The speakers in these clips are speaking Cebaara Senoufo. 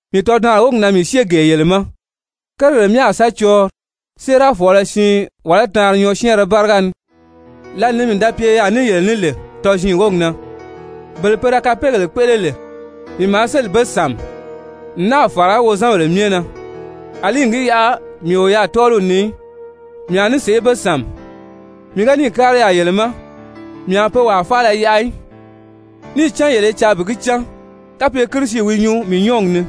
Mii tɔdaanri wógi na mii syée gee yele ma. «Kérigèle myɛ a sa cɔɔnri séerafɔɔlɔ siin, wàlá taanri nyɔɔsyɛɛnrɛ báriga ni.» Lǎli ni mii da pye yaà ní yele ní lè tɔziin wógi na, bele pe da kapeegèle kpéʔele lè, mii maa sélì be sàmi n náà fàra wozanbèle myɛ na, àlí n gi yaʔa mii o yaà tɔ́ɔliw ni í, mii a ní be sàmi, mii ga níì kári yaà yele ma, mii a pe wàa faala yaʔa í, níì cán yele i caa bi gi cán kapye Kirisi wi nyuu mii nyɔ́ɔgi ni,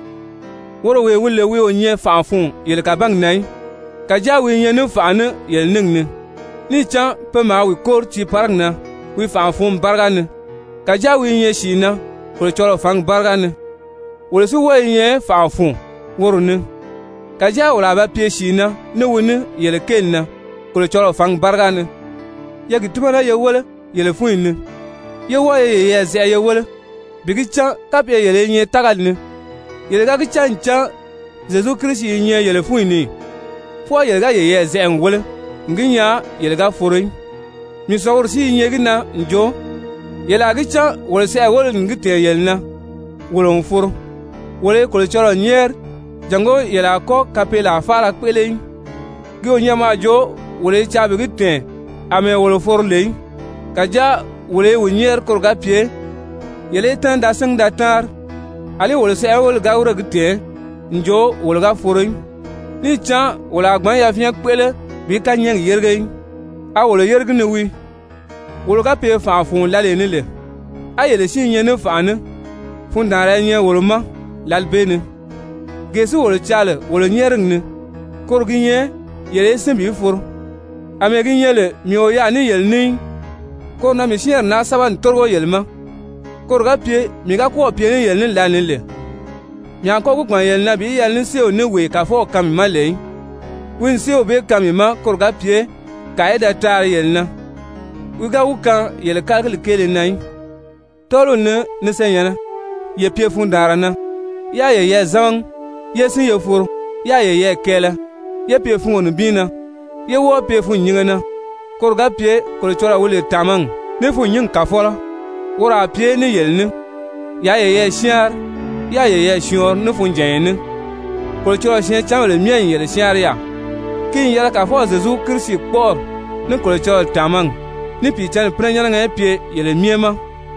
woro wee wi lè wi o nyɛ fànʔa fun yele kàbangi na í, kàjáa wi i nyɛ ní fànʔa ní yele níngi ni. Níì cán pe maa wi kóri tiiparigi na wi fànʔa-fǔnmi báriga ni, kàjáa wi i nyɛ sìi na Kolocɔlɔɔ fǎngi báriga ni. Wolo si wɔ́ɔ i nyɛ fànʔa fun woro ni, kàjáa wolo a ba pye sìi na ní wi ní yele kéeli na Kolocɔlɔɔ fǎngi báriga ni. Ye gi tímana ye wéle yele fúnyi ni, yé wɔ́ɔ ye yeyɛɛ zɛʔɛ ye wéle bi gi cán kapye yele i nyɛ tágali ni. Yele ga gi cán ncan Zyezu Kirisi i nyɛ yele fúnyi ni ì? Fwɔɔ yele ga yeyɛɛ zɛʔɛ n wéle n gi nyaa yele ga foro í. Mii sɔ̀ngumi si i nyɛ gi na n jo yele a gi cán wolo sɛʔɛweleli n gi tɛ̀ɛn yele na wolo n foro. Wolo i Kolocɔlɔɔ nyɛ́ɛri jàngó yele a kɔ́ kapeelaa faala kpéʔele í. Ki o nyɛ mɔ a jo wolo i caa bi gi tɛ̀ɛn àmɛɛ wolo foro lè í. Kàjáa wolo i wi nyɛ́ɛri koro ga pye yele í tɛ́nɛ da síngi da táanri, àlí wolo sɛʔɛweleli ga wírè gi tɛ̀ɛn n jo wolo ga foro í. Níì cán wolo a gbǎn yafyɛn kpéʔele bi kányɛɛgi yérige í. A wolo a yére gi ni wii. Wolo ga pye fànʔa fun lǎlee ni lè, á yele si i nyɛ ní fànʔa ní, fundaanra i nyɛ wolo ma lǎli bee ni, gee si wolo caa lè wolo nyɛ́ɛrigi ni, koro gi nyɛ yele í sín bi foro. Amɛɛ gi nyɛ lè mii o yaà ní yele ní í, koro na mii syɛ́ɛnri naa sɛ́bɛ n tórigo yele ma, koro ga pye mii ga kɔ́ɔ̀ pye ní yele ní lǎlee ni lè, mii a kɔ́ gi gbàn yele na bi yɛlɛ ní séew ní wee Kàfɔw kaan mii ma lè í, wi n séew bee kaan mii ma koro ga pye kàa í da taari yele na, wi ga wi kaan yele kálagili kéele na í. Tɔ́ɔliw ni, ni senyɛ̀nnɛ, ye pye fundaanra na, yaa yeyɛɛ zámagi yé sín ye foro, yáā yeyɛɛ kɛɛlɛ, yé pye fungo nibin na, ye wɔ́ɔ pye fûnnyinge na, koro ga pye Kolocɔlɔɔ wi lè tàmagi ní fûnnyingi Kàfɔlɔ, woro a pye ní yele ní. Yaa yeyɛɛ syáanri, yáā yeyɛɛ syɔɔnri ní funjànya ní. Kolocɔlɔɔ syɛɛncanbèle myɛ n yele syáanri yaà. Ki n yɛlɛ Kàfɔw Zyezu Kirisi kpɔ́ʔɔri ní Kolocɔlɔɔ tàmagi, ní Pìicǎnni pínɛnyɛnnɛgɛ í pye yele myɛ ma.